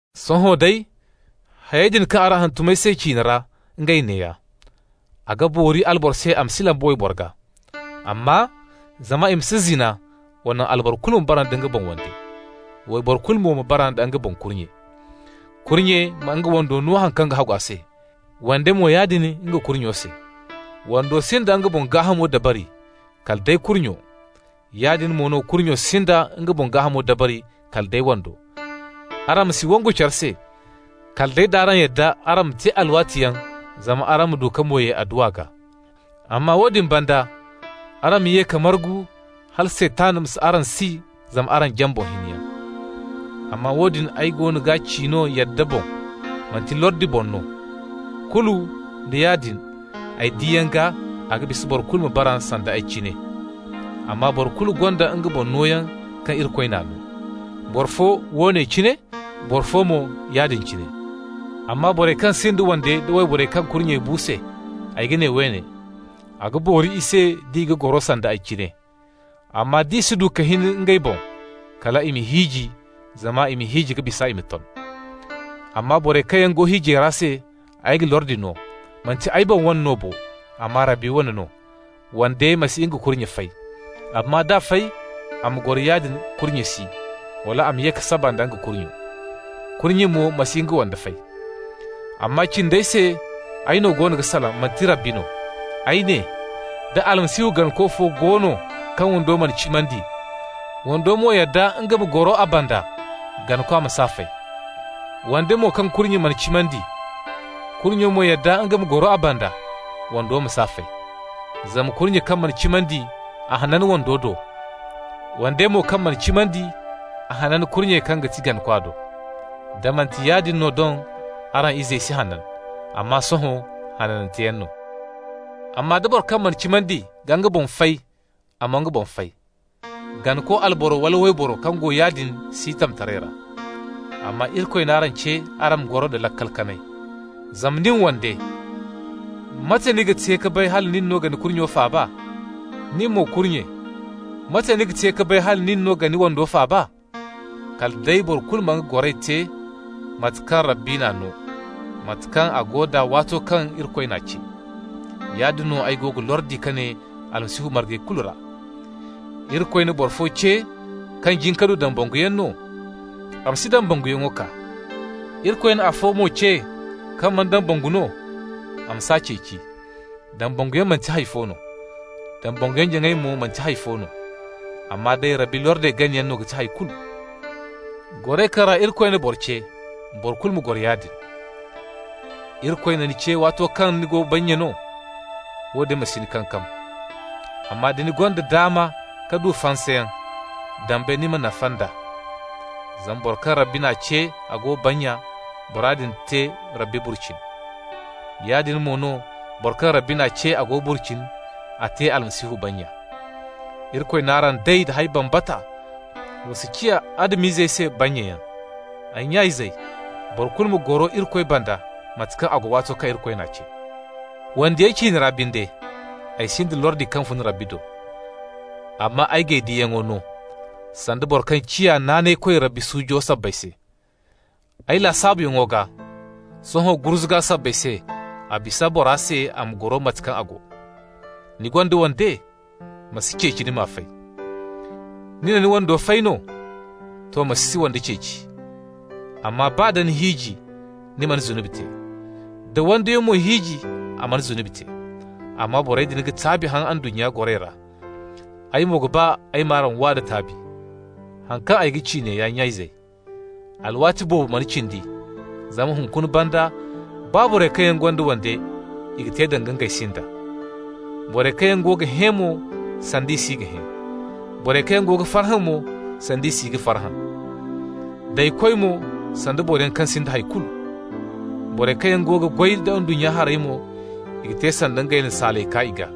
Sohõ day, hayey din kaŋ araŋ hantum ay se ciine ra, ngey neeya: A ga boori alboro se a ma si lamba wayboro gaa. Amma, zama i ma si zina, wa naŋ alboro kulu ma bara nda nga boŋ wande, wayboro kulu mo ma bara nda nga boŋ kurnye. Kurnye ma nga wando no haŋ kaŋ hagu a se, wande mo yaadin nga kurnyo se. Wando sinda nga boŋ gaahamo dabari, kala day kurnyo. Yaadin mo no kurnyo sinda nga boŋ gaahamo dabari, kala day wando. Araŋ ma si wangu care se, kala day d'araŋ yadda araŋ ma te alwaatiyaŋ zama araŋ ma du ka mo ye adduwa gaa. Amma woodin banda araŋ ma ye ka margu, hala Saytan ma si araŋ si zama araŋ jaŋ boŋ hiniyaŋ. Amma woodin ay goono ga ci no yadda boŋ, manti lordi boŋ no. Kulu nda yaadin, ay diyaŋo gaa a ga bisa boro kulu ma bara sanda ay cine. Amma boro kulu gonda nga boŋ nooyaŋ kaŋ Irikoy n'a no. Boro fo woone cine, boro fo mo yaadin cine. Amma borey kaŋ sinda wande nda wayborey kaŋ kurnye bu se, ay ga ne woone: a ga boori i se d'i ga goro sanda ay cine. Amma d'i si du ka hin ngey boŋ, kal i ma hiiji, zama i ma hiiji ga bisa i ma ton. Amma borey kaŋ go hiijay ra se ay ga lordi no -- manti ay boŋ wane no bo, amma Rabbi wane no -- wande ma si nga kurnye fay. (Amma d'a fay, a ma goro yaadin, kurnye si, wala a ma ye ka saba nda nga kurnyo.) Kurnye mo ma si nga wande fay. Amma cindey se ay no go ga salaŋ, manti Rabbi no. Ay ne: da Almasihu ganako fo go no kaŋ wando mana cimandi, wando mo yadda nga ma goro a banda, ganakwa ma s'a fay. Wande mo kaŋ kurnyo mana cimandi, kurnyo mo yadda nga ma goro a banda, wando ma s'a fay. Zama kurnye kaŋ mana cimandi, a hanan wando do, wande mo kaŋ mana cimandi, a hanan kurnye kaŋ ga ti ganakwa do. Da manti yaadin no doŋ araŋ izey si hanan. Amma sohõ hananteyaŋ no. Amma da boro kaŋ mana cimandi ga nga boŋ fay, a ma nga boŋ fay. Ganako alboro wala wayboro kaŋ go yaadin si tamtaray ra. Amma Irikoy n'araŋ ce araŋ ma goro nda laakal kanay. Zama nin, wande, mate ni ga te ka bay hala nin no ga ni kurnyo faaba? Ni mo, kurnye, mate ni ga te ka bay hala nin no ga ni wando faaba? Kala day boro kulu ma nga goray te mate kaŋ Rabbi n'a no, mate kaŋ a go d'a waato kaŋ Irikoy n'a ce. Yaadin no ay go ga lordi ka ne Almasihu margey kulu ra. Irikoy na boro fo ce kaŋ jin ka du dambanguyaŋ no? A ma si dambanguyaŋo kaa. Irikoy na afo mo ce kaŋ mana dambangu no? A ma s'a ceeci. Dambanguyaŋ manti hay fo no, dambanguyaŋ-jaŋay mo manti hay fo no, amma day Irikoy lordey ganayaŋ no ga ti hay kulu. Goray kaŋ ra Irikoy na boro ce, boro kulu ma goro yaadin. Irikoy na ni ce waato kaŋ ni go bannya no? Woodin ma si ni kankam. Amma da ni gonda daama ka du fansayaŋ, dambe ni ma nafa nd'a. Zama boro kaŋ Rabbi n'a ce, a go bannya, bora din te Rabbi burcini. Yaadin mo no, boro kaŋ Rabbi n'a ce a go burcini, a te Almasihu bannya. Irikoy n'araŋ day da hay bambata, wa si ciya Adam-izey se bannyayaŋ. Ay nya-izey, boro kulu ma goro Irikoy banda mate kaŋ a go waato kaŋ Irikoy n'a ce. Wandiyey ciine ra binde, ay sinda lordi kaŋ fun Rabbi do. Amma ay g'ay diyaŋey no, sanda boro kaŋ ciya naanaykoy Rabbi suujo sabbay se. Ay lasaabuyaŋo gaa, sohõ gurzuga sabbay se, a bisa bora se a ma goro mate kaŋ a go. Ni gonda wande? Ma si ceeci ni m'a fay. Ni na ni wando fay no? To, ma si wande ceeci. Amma baa da ni hiiji, ni mana zunubi te. Da wandiyo mo hiiji, a mana zunubi te. Amma borey din ga taabi haŋ ndunnya goray ra. Ay mo ga ba ay m'araŋ waa da taabi. Haŋ kaŋ ay ga ci neeya, nya-izey: alwaati boobo mana cindi. Zama hunkuna banda, baa borey kaŋ yaŋ gonda wande, i ga te danga ngey sinda. Borey kaŋ yaŋ go ga hẽ mo, sanda i si ga hẽ. Borey kaŋ yaŋ go ga farhã mo, sanda i si ga farhã. Daykoy mo, sanda boroyaŋ kaŋ sinda hay kulu. Borey kaŋ yaŋ go ga goy da ndunnya harey mo, i ga te sanda ngey na saalay kaa i gaa.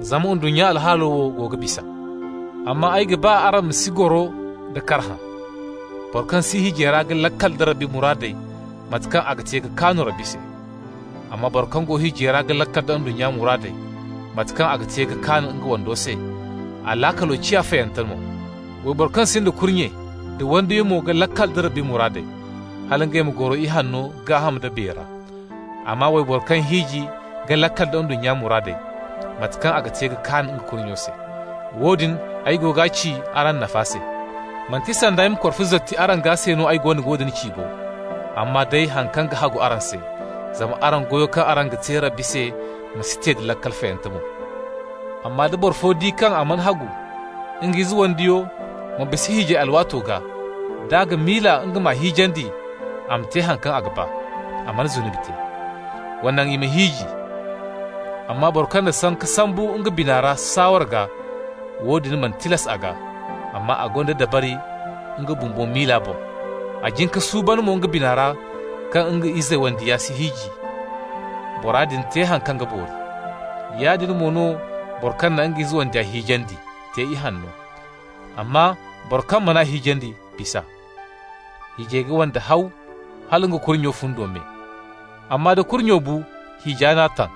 Zama ndunnya wo alhaalo go ga bisa. Amma ay ga ba araŋ ma si goro nda karhã. Boro kaŋ si hiijay ra ga laakal da Rabbi muraadey, mate kaŋ a ga te ka kaanu Rabbi se. Amma boro kaŋ go hiijay ra ga laakal da ndunnya muraadey, mate kaŋ a ga te ka kaan nga wando se, a laakalo ciya fayante mo. Wayboro kaŋ sinda kurnye nda wandiyo mo ga laakal nda Rabbi muraadey, hal ngey ma goro ihanno gaaham nda biya ra. Amma wayboro kaŋ hiiji ga laakal da ndunnya muraadey, mate kaŋ a ga te ka kaan nga kurnyo se. Woodin ay go ga ci araŋ nafa se. Manti sanda ay ma korfo zorti araŋ gaa se no ay go ga woodin ci bo, amma day haŋ kaŋ ga hagu araŋ se, zama araŋ goyo kaŋ araŋ ga te Rabbi se ma si te da laakal fayante mo. Amma da boro fo di kaŋ a mana hagu nga ize wandiyo ma bisa hiijay alwaato gaa, d'a ga miila nga m'a hiijandi, a ma te haŋ kaŋ a ga ba, a mana zunubi te. Wa naŋ i ma hiiji. Amma boro kaŋ na sanka sambu nga bina saaware gaa, woodin mana tilas a gaa, amma a gonda dabari nga bumbo miila boŋ, a jin ka suuban mo nga bina ra kaŋ nga ize wandiya si hiiji, bora din te haŋ kaŋ ga boori. Yaadin mo no boro kaŋ na nga ize wandiya hiijandi te ihanno, amma boro kaŋ man'a hiijandi bis'a. Hiijay ga wande haw hala nga kurnyo fundo me. Amma da kurnyo bu, hiija n'a taŋ,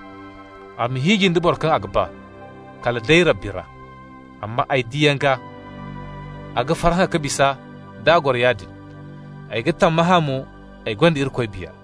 a ma hiiji nda boro kaŋ a ga ba, kala day Rabbi ra. Amma, ay diyaŋ gaa, a ga farhã ka bisa d'a goro yaadin. Ay ga tammahã mo ay gonda Irikoy Biya.